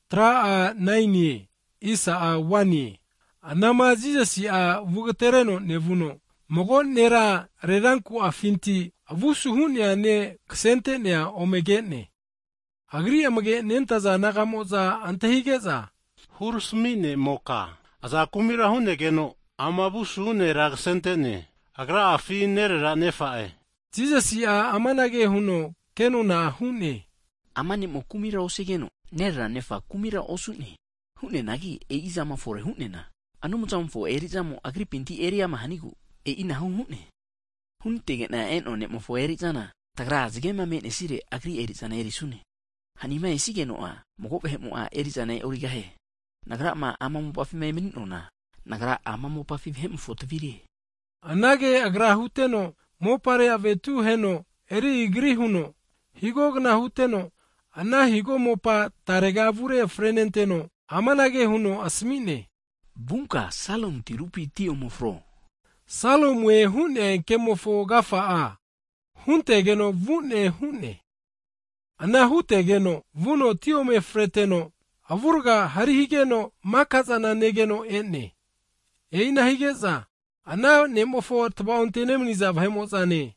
Hagi anama Jisasi'a vugatereno nevuno, mago nera reranku'afinti avu asuhu'nea ne' kasente'nea omege'ne. Agri'ma amage nentaza disaipol naga'mo'za antahige'za, Rempi hurami ne'moka (Rabbai) aza kumira hu'negeno ama avu asuhu nera kasente'ne, agra'afi nererapi nefa'e? Hazageno Jisasi'a amanage huno kenona hu'ne, Ama ne'mo kumira osigeno, nerera nefa'a kumira osu'ne. Hu'neanagi e'i zama fore hu'neana Anumzamofo eri'zamo agripinti eriama hanigu e'inahu hu'ne. Hunantege'na e'noa ne'mofo eri'zana, tagra zagema me'nesire Agri eri'zana erisune. Hanima esigeno'a mago vahe'mo'a erizana e'origahie. Nagrama ama mopafima emani'noa kna'afina, Nagra ama mopafi vahe'mofo Tavire. Anage Agra huteno, mopare avetu heno eri igri huno, higogna huteno, ana mopa tarega avure frenenteno, amanage huno asami'ne, Vunka Siloamu tirupi ti omefro. (Siloamue hu'nea kemofo agafa'a, huntegeno vu'ne hu'ne.) Ana hutegeno vuno ti ome freteno, avurga hari higeno mika'zana negeno e'ne. E'ina hige'za, ana ne'mofo tavaonte nemani'za vahe'mo'zane,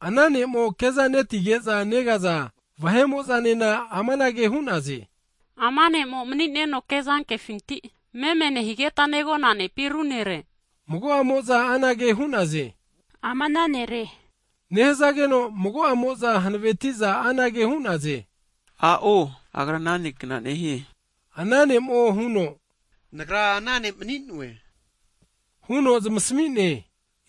ana ne'mo ke'zatino meme nehige'za negaza vahe'mo'zanena amanage hu'naze, Ama ne'mo mani'neno kezatino meme nehigeta negona nepi ru nere? Mago'amo'za anage hu'naze, Ama ana nere nehazageno, mago'amo'za hanaveti'za anage hu'naze, A'o agra ana ne' kna'nehie. Ana ne'mo huno, Nagra ana ne' mani'noe, huno zamasmi'ne!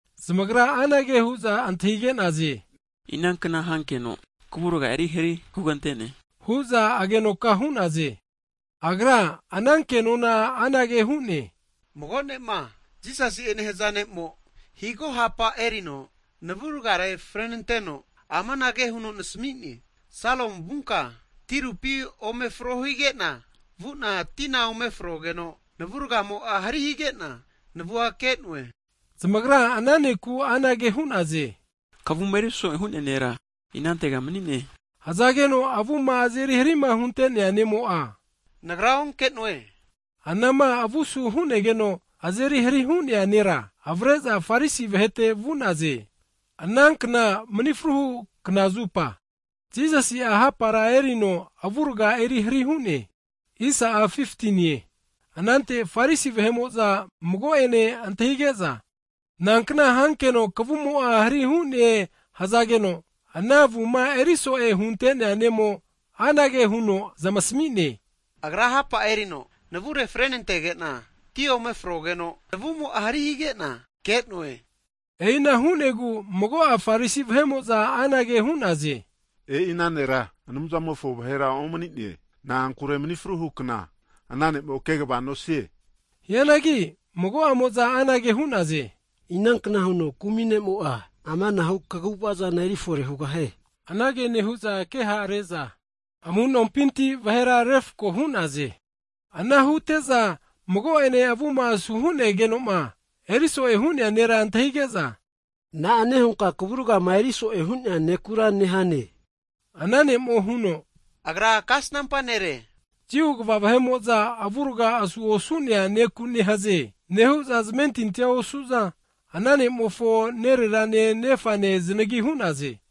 Zamagra anage hu'za antahige'naze, Inankna hankeno kavurga eri hari hugante'ne? hu'za agenoka hu'naze. Agra ana ke'nona anage hu'ne, Mago ne'ma Jisasi'e nehaza ne'mo, mopa erino tinuti eri igri huteno navurgare frenanteno, amanage huno nasmi'ne, Siloamu vunka tirupi omefro hige'na, vu'na tina ome frogeno, navu ragamo'a hari hige'na navua ke'noe. Hige'za zamagra ana ne'ku anage hu'naze, Kavuma eri so'e hu'nea nera inantega mani'ne? Hazageno avuma azeri harima hunte'nea ne'mo'a, Nagra onke'noe hu'ne. Hagi anama avu asu hu'negeno azeri hari hu'nea nera, avare'za Farisi vahete vu'naze. Anankna mani fruhu kna (sabat) zupa Jisasi'a hapara erino avurga eri hari hu'negeze. Anante Farisi vahe'mo'za mago'ene antahige'za, Nankna hankeno kavumo'a hari hu'ne hazageno, ana avuma eri so'e hunte'nea ne'mo anage huno zamasmi'ne, Agra hapa erino navure frenantege'na, ti ome frogeno navumo'a hari hige'na ke'noe. E'ina hu'negu mago'a Farisi vahe'mo'za anage hu'naze, E'i ana nera Anumzamo'a huntegeno ome'ne, na'ankure mani fruhu kna ana ne'mo'a kegava nosie. Hianagi mago'amo'za anage hu'naze, inankna huno kumi ne'mo'a amanahu kaguvazana erifore hugahie? Anage nehu'za keha're'za amu'nompinti vahera refko hu'naze. Ana hute'za mago'ene avuma asu hu'negeno'ma, eriso'e hu'nea nera antahige'za, na'ane hunka kavurgama eriso'e hu'nea nekura nehane? Hazageno ana ne'mo'a huno, Agra kasnampa nere. Jiu kva vahe'mo'za, avurga asu osu'nea neku nehaze, nehu'za zamentinti osu'za, ana ne'mofo nererane nefane zanagi hu'naze.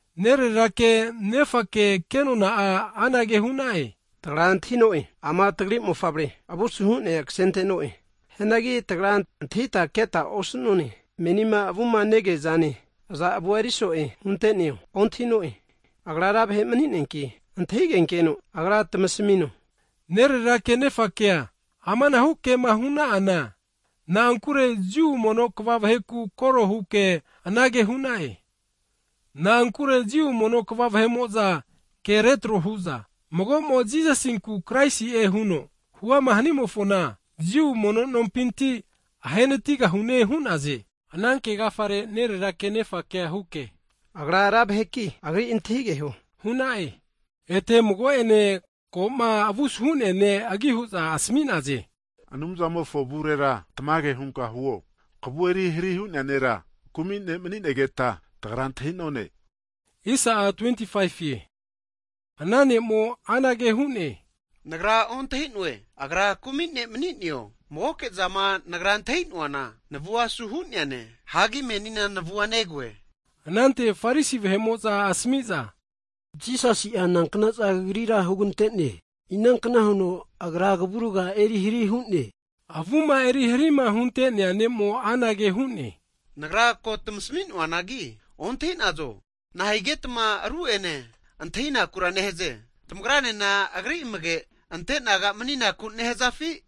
Nererake, nefake kenona'a anage hu'na'e, Tagra antahi'no'e, ama tagri mofavre, avu asu hu'nea kasente'no'e. Hianagi tagra antahita keta osu'none, menima avuma negea'zane, aza avua eri so'e hunte'neo ontahi'no'e. Agra ra vahe mani'neanki, antahigenkeno agra'a tamasamino. Nererake nefakea amanahu kema hu'na'ana, na'ankure Jiu mono kva vaheku koro huke anage hu'na'e. Na'ankure Jiu mono kva vahe'mo'za ke retro hu'za, mago'mo Jisasinku Kraisi'e huno, huama hanimofona, Jiu mono nompinti (Sinagog) ahe natigahune, hu'naze. Ana ke agafare nererake nefakea huke, agra ra vaheki agri antahigeho hu'na'e. Ete mago'ene, ko'ma avu asuhu'nea ne' agi hu'za asmi'naze, Anumzamofo avure tamage hunka huo, kavu eri hari hu'nea nera, kumi ne' mani'negeta tagra antahi'none. Hazageno ana ne'mo'a anage hu'ne, nagra ontahi'noe Agra kumi ne' mani'neo, magoke'zama nagra antahi'noana, navua asu hu'neane, menina navu negoe. Anante Farisi vahe'mo'za asami'za, Jisasi'a nankna'za kagrira hugante'ne? Inankna huno Agra kavurga eri hari hu'ne? Avuma eri harima huntenea ne'mo anage hu'ne, nagra ko tamasmi'noanagi ontahi'nazo. Nahigetma ru'ene antahinakura nehaze? Tamagra nena Agri amage'ante disaipol naga maninaku nehazafi?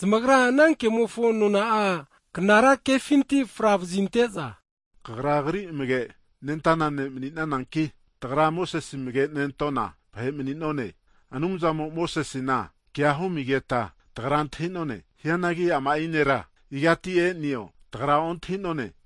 Zamagra ana kemofo nona'a knara kefinti fra vazinte'za, kagra Agri amage nentana disaipol ne' mani'nananki, tagra Mosese amage nentona vahe mani'none! Anumzamo Mosesena kea humigeta tagra antahi'none, hianagi ama'i nera igati e'neo, tagra ontahi'none.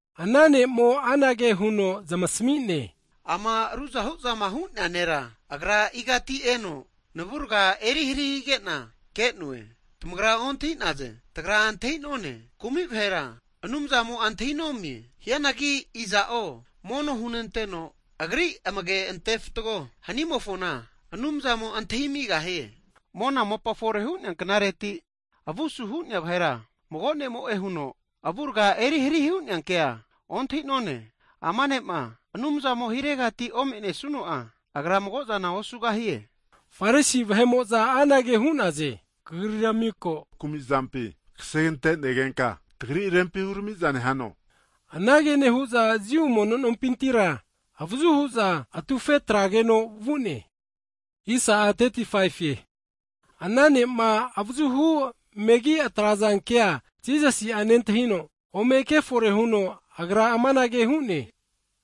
Ana ne'mo anage huno zamasmi'ne, Ama ruzahu'zama hu'nea nera, Agra igati eno, navurga eri hari hige'na ke'noe, tamagra ontahi'naze! Tagra antahi'none, kumi vahera Anumzamo'a antahi'nomie, hianagi iza'o mono hunenteno Agri amage' ante fatgo hani'mofona, Anumzamo antahiamigahie. Mona mopa fore hu'nea knareti, avu asu hu'nea vahera mago ne'mo'e huno avurga eri hari hu'nea kea ontahi'none. Hazageno ama ne'ma Anumzamofontegatima ome'nesuno'a, Agra mago'zana osugahie. Hige'za Farisi vahe'mo'za anage hu'naze, Kagrira miko kumi'zampi kasegante negenka, tagri rempi hurami'za nehano? Anage nehu'za Jiu vahe mono nompintira (Sinagog) avazu hu'za, atufe atrageno vu'ne. Hagi ana ne'ma avazuhu megi atraze kea Jisasi'a nentahino, ome kefore huno Agra amanage hu'ne,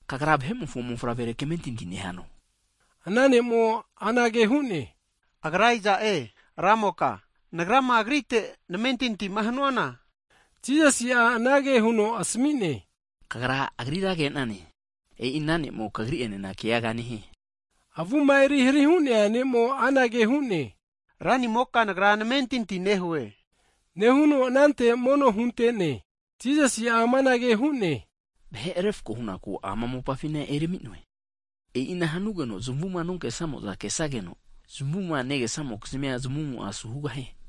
Kagra Vahe'mofo Mofavrere kamentinti nehano? Higeno ana ne'mo'a anage hu'ne, Agra iza'e ramoka, nagrama Agrite namentinti'ma hanuana? Jisasi'a anage huno asmi'ne, Kagra Agrira negane, e'i ana ne'mo kagri'enena keaga nehie. Avuma eri hari hu'nea ne'mo anage hu'ne, Ranimoka nagra namentinti hue, nehuno anante mono hunte'ne. Jisasi'a amanage hu'ne, Vahe refko hunaku ama mopafina ermi'noe, e'ina hanugeno zamuma nonke'samo'za kesageno, zamuma negesa'mokizmi zamumo'a asu hugahie.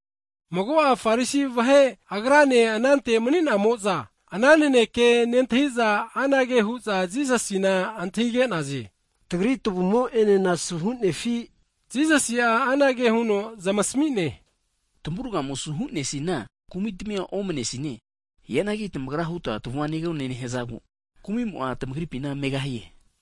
Mago'a Farisi vahe Agrane anante mani'namo'za, ana naneke nentahi'za anage hu'za Jisasina antahige'naze, Tagri tavumo'enena asu hu'nefi? Jisasi'a anage huno zamasmi'ne, Tamavurgamo asu hu'neasina kumi'tmia omne sine, hianagi tamagra huta tavua negone nehazagu, kumi'mo'a tamagripina me'ne.